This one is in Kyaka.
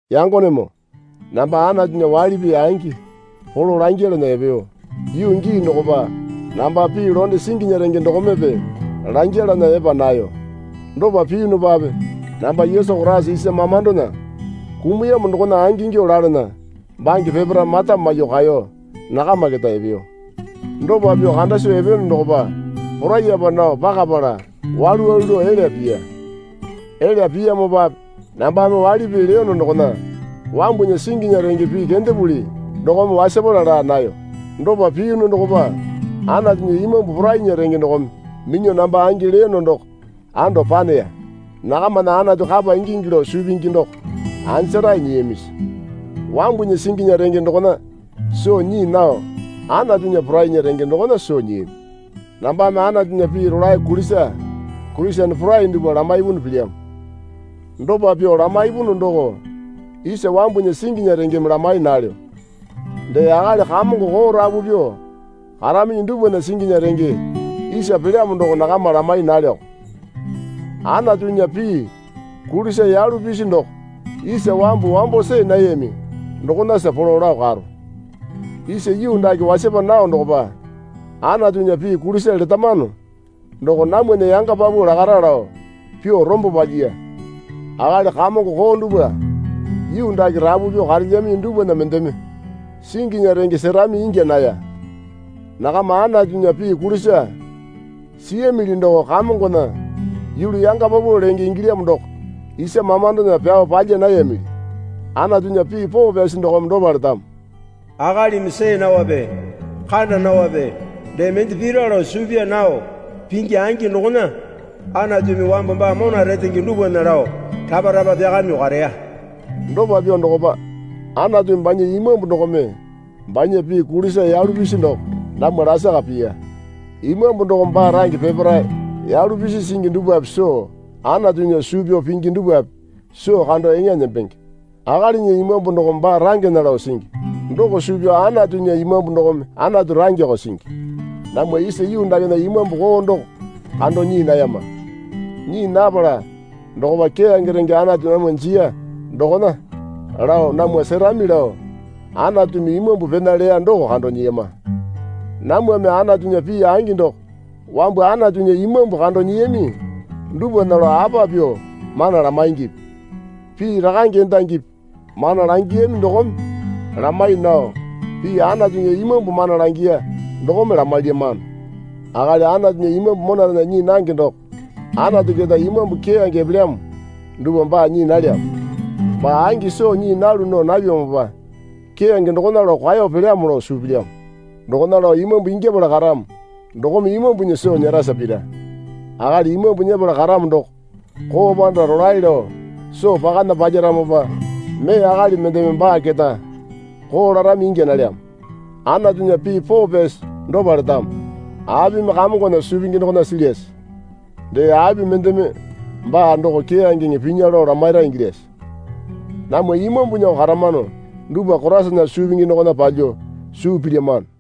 Yangonemoo namba Anatunya waili pii angi polo langyalana epeyo yuu gii dokopa namba pii londe singinya renge dokomepe langyalana epa nayo. Dopa piyunupape namba Yesu Koraisa isa mamandona kumuyamo dokona angingyuo lalana bange peparae mata maiyuo kaeyo nakama keta epeyo. Dopa pyuo kanda soo epeyono dokopa poraiyapa nao pakapala walu walu lao elya piya. Elya piyamopape nambame waili pii leyono dokona wambunya singinya renge pii kendepuli dokome wasapala laa nayo. Dopa piyunu dokopa Anatunya Imambu porainya renge dokome minyuo namba angi leyono doko ando paneya. Nakamana Anatu kapa ingingi lao suu pingi doko anjarae nyiyamisi? Wambunya singinya renge dokona soo nyii nao Anatunya porainya renge dokona soo nyiyami. Nambame Anatunya pii rolae kulisa Kurisene porai dupwa lamaipunu pilyamo. Dopa pyuo lamaipunu doko isa wambunya singinya rengeme lamai nalyo. Dee akali kamongo koo rapu pyuo karaminyi dupwana singinya renge isa pelyamo doko nakama lamai nalyoko. Anatunya pii kulisa yalu pisi doko isa wambu wambo see nayami dokonasa polo lao karo. Isa yuu dake wasapa nao dokopa Anatunya pii kulisa letamano doko namwana yanga paupau lakara lao pyuo rombo palyiya. Akali kamongo koo dupwa yuu dake rapu pyuo karelyaminyi dupwana mendeme singinya renge serami ingya naya. Nakama Anatunya pii kulisa siyamili doko Kamongona yulu yanga paupau lenge ingilyamo doko isa mamandona pyao palya nayamili. Anatunya pii poo pyasi dokome dopa letamo. Akalimi see naope kanda naope dee mende pira lao suu pyaa nao pingi angi dokona Anatumi wambu baa mona retenge dupwana lao rapa rapa pyakamyuo kareya. Dopa pyuo dokopa Anatumi banya Imambu dokome banya pii kulisa yalu pisi doko namwa lasaka piya. Imambu dokome baa range peparae yalu pisi singi dupwape soo Anatunya suu pyao pingi dupwape soo kando eŋa nembenge. Akalinya imambu dokome baa rangena lao singi. Doko suu pyao Anatunya Imambu dokome Anatu rangeko singi. Namwa isa yuu dakena imambu koo doko kando nyii nayama. Nyii napala dokopa keyange renge Anatu namwa jiya dokona lao namwa serami lao Anatumi Imambu pena leya doko kando nyiyama. Namwame Anatunya pii angi doko wambu Anatunya Imambu kando nyiyami dupwana lao apa pyuo mana lamaingipi? Pii rakange endangipi mana langiyami dokome lamai nao pii Anatunya Imambu mana langiya dokome lamailyamano. Akali Anatunya Imambu monarena nyii nange doko Anatu keta Imambu keyange epelyamo dupwa baa nyii nalyamo. Baa angi soo nyii nalu nao napyamopa keyange dokona lao kwao pelyamo lao suu pilyamo. Dokona lao imambu ingyapala karamo dokome imambunya soo nyerasa pira. Akali Imambu nyepala karamo doko koo panda rolae lao soo pakana palyaramopa mee akali mendeme baa keta koo larami ingya nalyamo. Anatunya pii poo pyasi dopa letamo. Apimi Kamongona suu pingi dokona silyase? Dee api mendeme baa doko keyangeŋe pinya lao lamaira ingilyase? Namwa Imambunyako karamano dupwa Koraisana suu pingi dokona palyuo suu pilyamano.